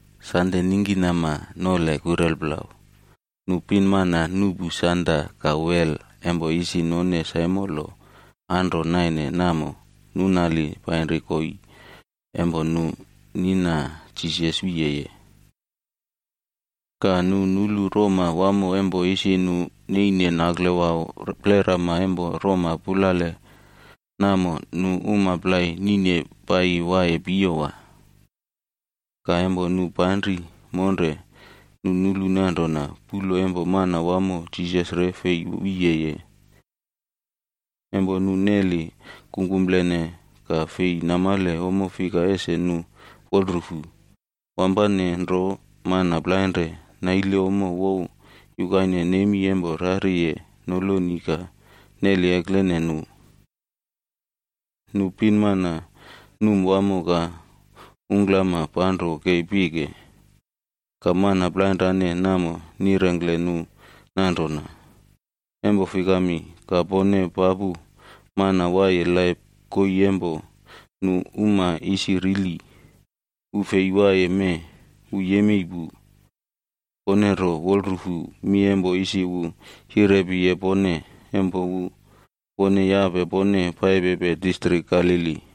Sande ningkinama nole kurelplau, nu pinmana nuꞌpu sanda ka wel empo isi none saimolo anro naine namo, nunali painri koii empo nu nina Jisas wiyeye. Ka nu nulu roma wamo empo isi nu neine naklewau plerama empo roma pulale namo nu uma plai nine paiyi waiye piyowa. Ka empo nu panri rompulale, nu nulu nanrona puꞌlo empo Manawamo Jisas re fei wiyeye. Empo nu neli kungkumplene ka fei namale ommo fika ese nu wolrufu, wampane nro mana plainre naile ommo wow yukaine nemi empo rariye noloni ka neli eklene nu. Nu pinmana, num wamo ka ungklama panro kei pike. Ka mana plainrane namo nirengkle nu nanrona, “Empo fikami, ka pone papu mana waiye laip koii empo nu uma isi rili? Wu fei waiye mee, wu yemei pu. Pone ro wolrufu mi empo isi wu yirepiye pone empo wu wone yape pone paipepe distrik Galili.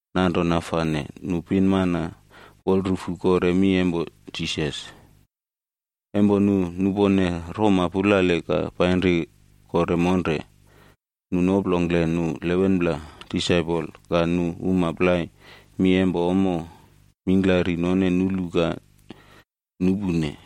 Nanrona fane nu pinmana, wolrufu kore mi empo Jisas. Empo nu nupone roma pulale ka painri kore monre, nu noplongkle nu 11pla disaipol ka nu uma plai mi empo ommo mingklari none nulu ka nupune.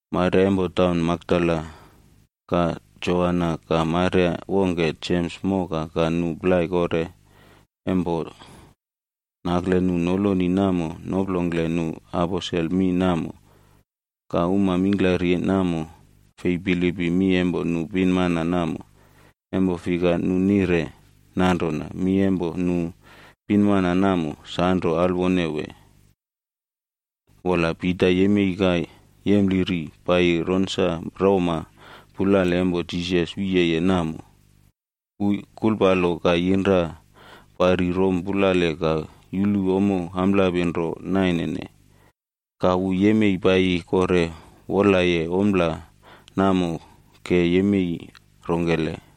Maria empo taun Makdala, ka Joana ka Maria wongke Jems moka ka nu plai kore empo nakle nu noloni namo noplongkle nu aposel mi namo. Ka uma mingklari namo, fei bilipim mi empo nu pinmana namo. Empo fika, nu nire nanrona mi empo nu pinmana namo sanro alwone wee. Wola Pita yemei ka yempliri paiyi ronsa roma pulale empo Jisas wiyeye namo. Wu kulpalo ka yinra pari rom pulale ka yulu ommo amplapi nro nainene. Ka wu yemei paiyi kore wolaye ompla namo ke yemei rongkele.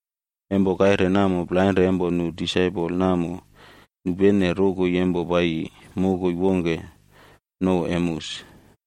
Empo kaire namo, plainre empo nu disaipol namo nupene rokoi empo paiyi mokoi wongke nouw Emeus.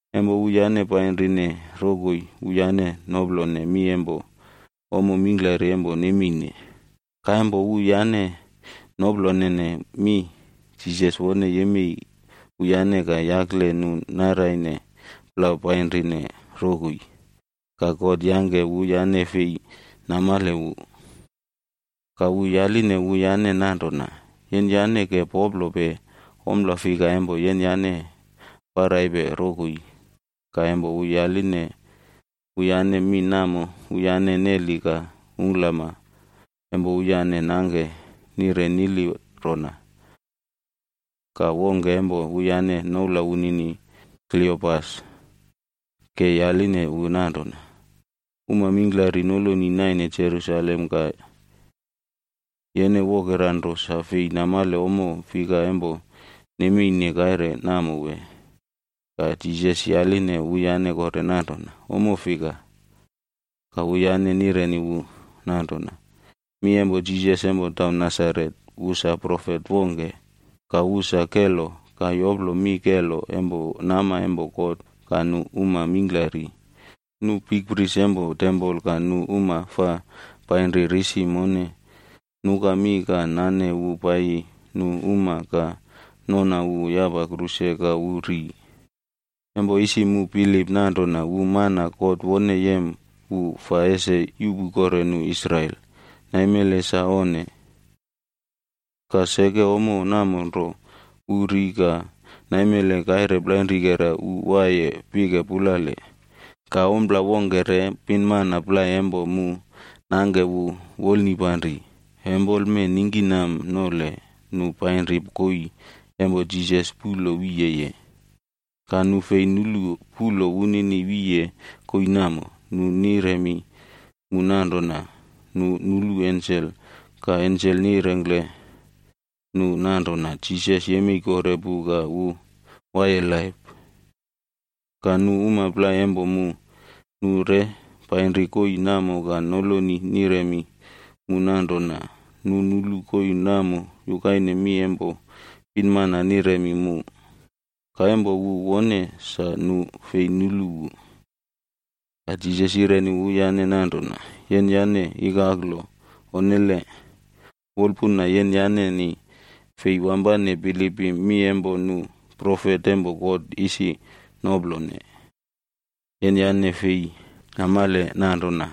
Empo wuyane painrine rokoi, wuyane noplone mi empo ommo mingklari empo nemeine. Ka empo wuyane noplolene mi, Jisas wone yemei wuyane ka yakle nu naraine plau painrine rokoi. Ka God yangke wuyane fei namale wu. Ka wu yaline wuyane nanrona, “Yenyane ke poplope ompla fika empo yenyane paraipe rokoi?” Ka empo wu yaline wuyane mi namo, wuyane neli ka ungklama empo wuyane nangke nire nili rona. Ka wongke empo wuyane noula wunini Kliopas ke yaline wu nanrona, “Uma mingklari noloni naine Jerusalem ka yene wokera nro sa fei namale ommo fika empo nemeine kaire namo wee?” Ka Jisas yaline wuyane kore nanrona, “Ommo fika?” Ka wuyane nireni wu nanrona, “Mi empo Jisas empo taun Nasaret. Wu sa profet wongke, ka wu sa kelo ka yoplo mi kelo empo nama empo God ka nu uma mingklari. Nu bikpris empo tempol ka nu uma fa painri risi mone, nuka mi ka nane wu paiyi nu uma ka nona wu yapa kruse ka wu ri. Empo isi mu bilip nanrona wu mana God wone yem wu fa ese yuꞌpu kore nu Israel. Naimele sa onne. Ka seke ommo namo nro, wu ri ka naimele kaire plainrikerab wu waiye pike pulale. Ka ompla wongke re, pinmana plai empo mu nangke mu wolnipanri. Empoleme ningkinam nole, nu painri koii empo Jisas puꞌlo wiyeye. Ka nu fei nulu puꞌlo wunini wiye koii namo. Nu niremi mu nanrona nu nulu ensel, ka ensel nirengkle nu nanrona Jisas yemei kore pu ka wu waiye laip. Ka nu uma plai empo mu, nu re painri koii namo ka noloni niremi mu nanrona nu nulu koii namo yukaine mi empo pinmana niremi mu. Ka empo wu wone, sa nu fei nulu wu.” Ka Jisas yireni wuyane nanrona, “Yenyane ikaklo onnele. Wolpuna yenyaneni fei wampane bilipim mi empo nu profet empo God isi noplone. Yenyane fei namale nanrona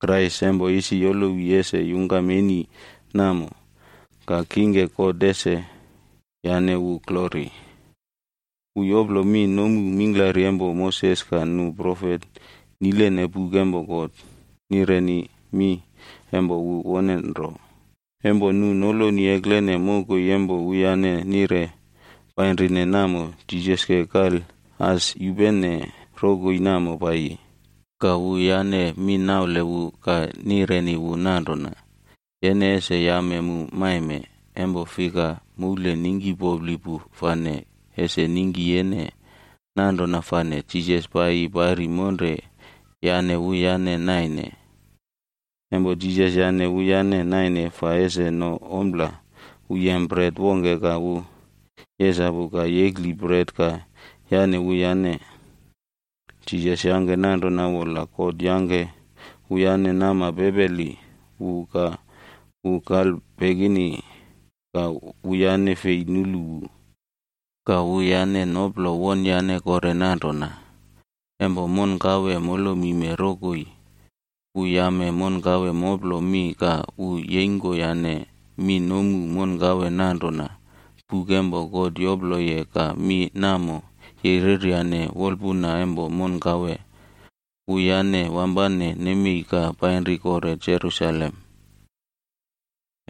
Kraisc empo isi yolowi ese yungkam eni namo, ka kingke God ese yane wu glori?” Wu yoplo mi nomu mingklari empo Moses ka nu profet nilene buk empo God, nirene mi empo wu wone nro. Empo nu noloni eklene mokoi empo wuyane nire painrine namo, Jisas ke kal as yupene rokoi namo paiyi. Ka wuyane mi naule wu ka nireni wu nanrona, “Yene ese yame mu maime, empo fika, moule ningkipopli pu fane ese ningki yene.” Nanrona fane Jisas paiyi pari monre yane wuyane naine. Empo Jisas yane wuyane naine fa ese no ompla, wu yem bret wongke ka wu yesapu ka yekli bret ka yane wuyane. Jisas yangke nanrona wola God yangke wuyane nama pepeli wu ka wu kalpekini ka wuyane fei nulu wu. Ka wuyane noplo wonyane kore nanrona, “Empo monkawe molomime rokoi, wu yame monkawe moplo mi ka wu yeingkoyane mi nomu monkawe nanrona buk empo God yoploye ka mi namo yereryane wolpuna empo monkawe.” Wuyane wampane nemei ka painri kore Jerusalem.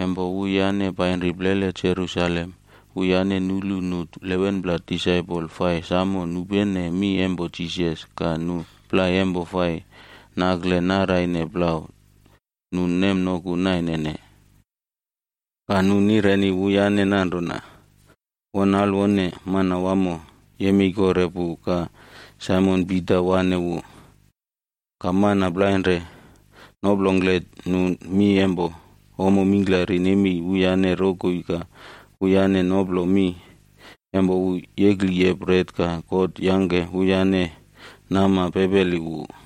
Empo wuyane painri plele Jerusalem, wuyane nulu nu 11pla disaipol fai samo nupene mi empo Jisas ka nu plai empo fai nakle naraine plau nu nemnoku nainene. Ka nu nireni wuyane nanrona, “Won alwone! Manawamo yemei kore pu ka Saimon Pita waꞌne wu.” Ka mana plainre noplongkle nu mi empo ommo mingklari nemei wuyane rokoi ka wuyane noplo mi empo wu yekliye bret ka God yangke wuyane nama pepeli wu.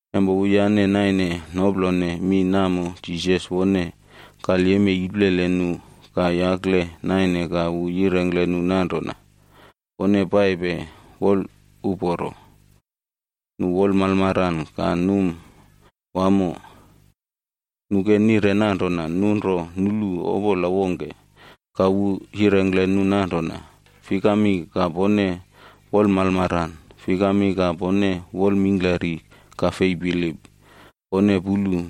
Empo wuyane naine noplone mi namo, Jisas wone kalyemei iplele nu ka yakle naine ka wu yirengkle nu nanrona, “Pone paipe wolraulo.” Nu wolmalmaran ka num wamo. Nu ke nire nanrona nu ro nulu opola wongke. Ka wu yirengkle nu nanrona, “Fikami ka pone wolmalmaran? Fikami ka pone wolmingklari ka fei bilip? Pone pulu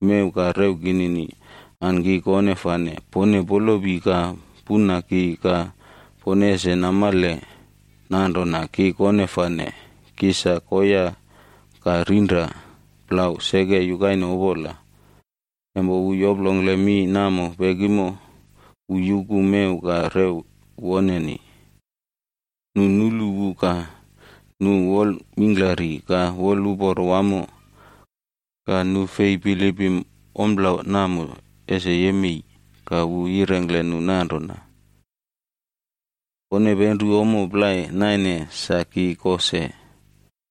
mew ka rew kinini. An ki kone fane! Pone polopi ka puna ki ka pone ese namale nanrona ki kone fane. Ki sa koya ka rinra plau seke yukaine opola.” Empo wu yoplongkle mi namo pekimo, wu yuku mew ka rew woneni. Nu nulu wu ka nu wolmingklari ka woluporo wamo, ka nu fei bilipim ompla namo ese yemei. Ka wu yirengkle nu nanrona, “Pone penru ommo plai naine sa ki ko se?”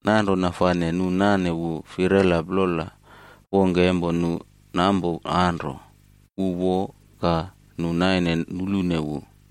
Nanrona fane nu nane wu firela plola wongke empo nu nampo anro, wu wo, ka nu naine nulune wu.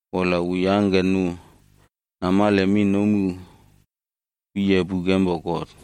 Wola wu yangke nu namale mi nomu wiye buk empo God.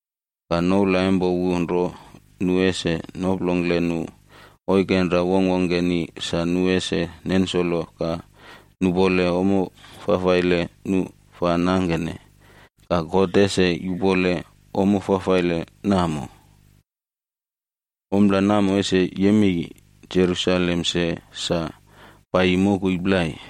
Ka noula empo wu nro nu ese noplongkle nu oikenra wongkwongkeni sa nu ese nensolo ka nupole ommo fafaile nu fa nangkene ka God ese yupone ommo fafaile namo. Ompla namo ese yemei Jerusalem se, sa paiyi mokoi plai.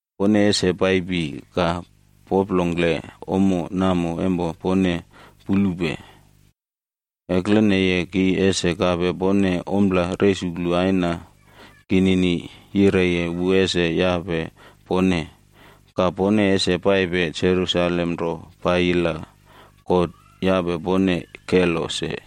Pone ese paipi ka poplongkle ommo namo empo pone pulupe. Ekleneye ki ese kape pone ompla resuklu Aina kinini yireye wu ese yape pone. Ka pone ese paipe Jerusalem ro paiyi la God yape pone kelo se.”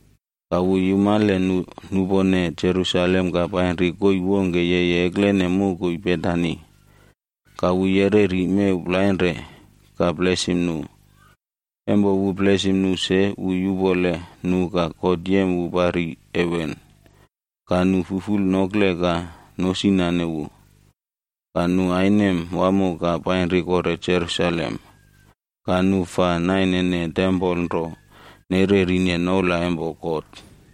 Ka wu yumale nu nupone Jerusalem ka painri koii wongke yeye eklene mokoi Betani, ka wu yereri mew plainre ka blesim nu. Empo wu blesim nu se, wu yupole nu ka God yem wu pari heven. Ka nu fuful nokle ka nosinane wu, ka nu ainem wamo ka painri kore Jerusalem. Ka nu fa nainene tempol nro nererine noula empo God.